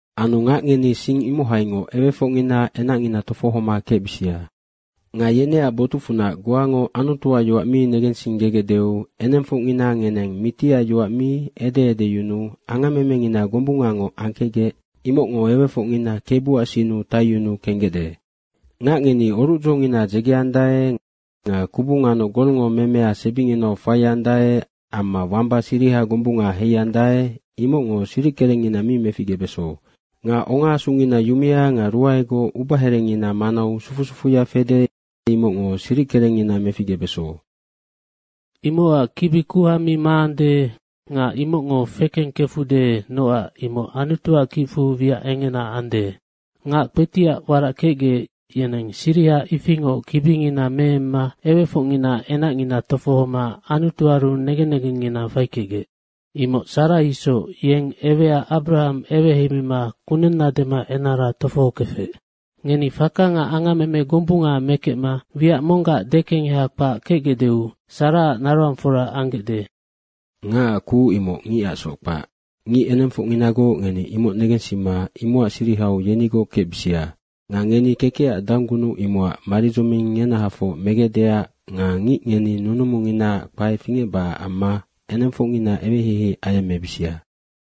Anu ngac ngeni sing imohaingoc ewefocngina enacngina tofohoma kecbisia. Nga yeneac botucfunac goango Anutuac yoac mi negensinggegecdeu enengfocngina ngeneng Mitiac yoac mi ede edeyunuu angammemengina gombungangoc angkecgec, imocngo ewefocngina Kebuac sinnu taiyunuu kenggecde. Ngac ngeni orucdzongina dzegeandae nga kubu nganoc golngo memea sebinginau faiandae amma wamba siriha gombunga heiandae, imocngo siric kerengngina mi meficgebeso. Nga ongaasungina yumea nga ruaegoc ubaherengina manau sufu sufuya fede, imocngo siric kerengngina meficgebeso. Imocac kibi kuha mi maande nga imocngo fekengkefude nocac imoc Anutuac kicfu wiac engena ande. Ngac kpetiac warac kecgec, yeneng siriha ifingoc kibingina meemma ewefocngina enacngina tofohoma Anutuaru negen negengngina faikecgec. Imoc Sara isoc, yeng ewea Abrahang eweheimima kunenna dema enara tofohokefec. Ngeni faka nga angammeme gombunga mekecma wiac monggac dekengeha kpac kecgecdeu Saraac naroangfora anggecde. Ngacac kuc, imoc ngicacsoc kpac. Ngic enengfocnginagoc ngeni imoc negensima imocac sirihau yenigoc kecbisia. Nga ngeni kekecac danggunuc imocac maridzoming ngenahafoc megecdeac nga ngic ngeni nunumunginaac kpae fingecbacac amma enengfocngina eweheihei ayemmebisia.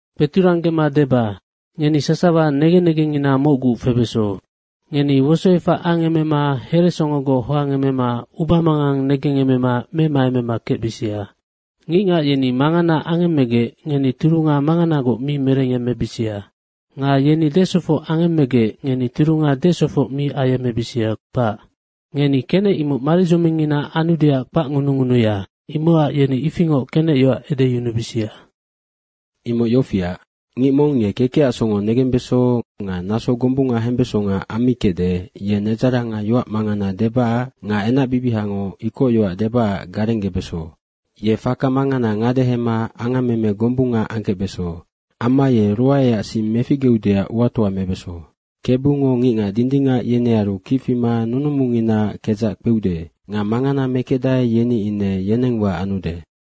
Kpeturanggema deba, ngeni sasawa negen negengngina mocgu febeso. Ngeni wosoefac angemema heresongogoc hoangemema ubamangang negengemema memaemema kecbisia. Ngicngac yeni mangana angemmegec ngeni turunga manganangoc mi merengyemmebisia nga yeni desofoc angemmegec ngeni turunga desofocngoc mi ayemmebisia, kpac. Ngeni kenec imoc maridzomingngina anudeac kpacngunungunuya, imocac yeni ifingoc kenecyoac edeyunubisia. Imoc yofiac, “Ngic mong ye kekecac songo negembeso nga naso gombunga hembesonga ammikecde, ye nedzaranga yoac mangana debacac nga enacbibihango ikocyoac debacac garenggebeso. Ye faka mangana ngadehema angammeme gombunga angkecbeso. Amma ye ruaeac sing meficgeudeac uatoa mebeso. KEBUNGO ngicngac dindingac yenearu kic fima nunumunginaac kedzac kpeude. Nga mangana mekecdae, yeni ine yenengwa anude.”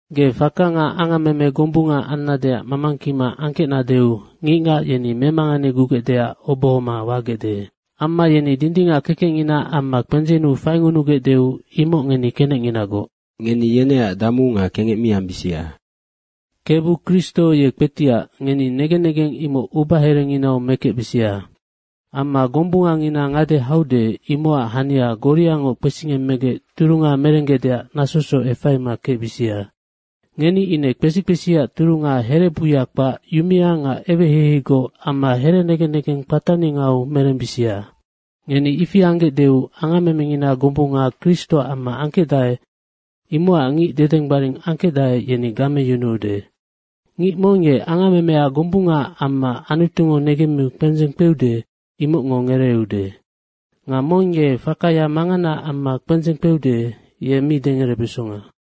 Ge faka nga angammeme gombunga annadeac mamangkima angkecnadeu ngicngac yeni memanganegugecdeac obohoma wagecde. Amma yeni dindingac kekecnginaac amma kpendzennu faingunugecdeu, imoc ngeni kenecnginagoc. Ngeni yeneac damu nga kengec mi ambisia. Kebu Kristo ye kpetiac, ngeni negen negeng imoc ubaherenginau mekecbisia. Amma gombungangina ngade haude, imocac hania goriangoc kpesingemmegec turunga merenggecdeac nasosoc efaima kecbisia. Ngeni ine kpesi kpesiac turunga herebuya kpac, yumea nga eweheiheigoc amma here negen negeng kpataningau merembisia. Ngeni ifi anggecdeu, angammemengina gombunga Kristoac amma angkecdae, imocac ngic dedenggbaring angkecdae, yeni gameyunuude. Ngic mong ye angammemea gombungaac amma Anutungo negemmiu kpendzeng kpeude, imocngo ngereeude. Nga mong ye fakaya manganaac amma kpendzeng kpeude, ye mi dengerebesonga.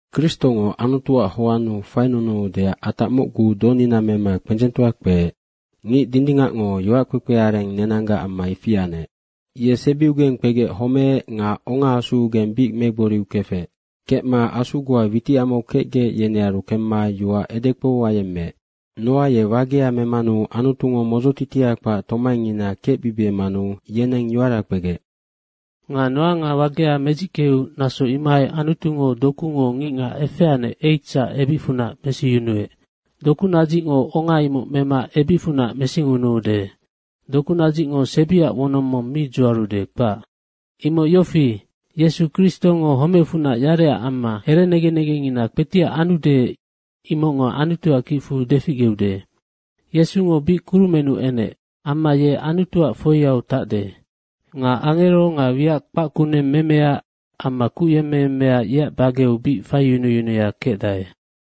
Kristongo Anutuac hoannu fainunuudeac atac mocgu donina mema kpendzengtoa kpeec. Ngic dindingacngo yoackpekpe areng nenanggac amma ifi anec. Ye sebiugeng kpegec homeec nga ongaasuugeng bic megboriu kefec. Kecma asu goa witicamau kecgec, yenearu kemma yoac edekpou ayemmeec. Noa ye wagea memanu Anutungo modzotitia kpac tomaingina kecbibiemanu yeneng yoara kpegec. Nga Noango wagea medzickeu naso imohai Anutungo dokungo ngicngac efeanec, 8sac ebicfunac mesiyunuec. Dokunadzicngo onga imoc mema ebicfunac mesingunuude. Dokunadzicngo sebiac wonong mong mi dzuarude, kpac. Imoc yofi, Yesu Kristongo homecfunac yarecac amma herenegen negengngina kpetiac anude, imocngo Anutuac kicfu deficgeude. Yesungo bic kurumennu enec. Amma ye Anutuac foiau tacde. Nga angero nga wiac kpac kuneng memea amma kuc yemmeyemmea, yeac bageu bic faiyunuyunuya kecdae.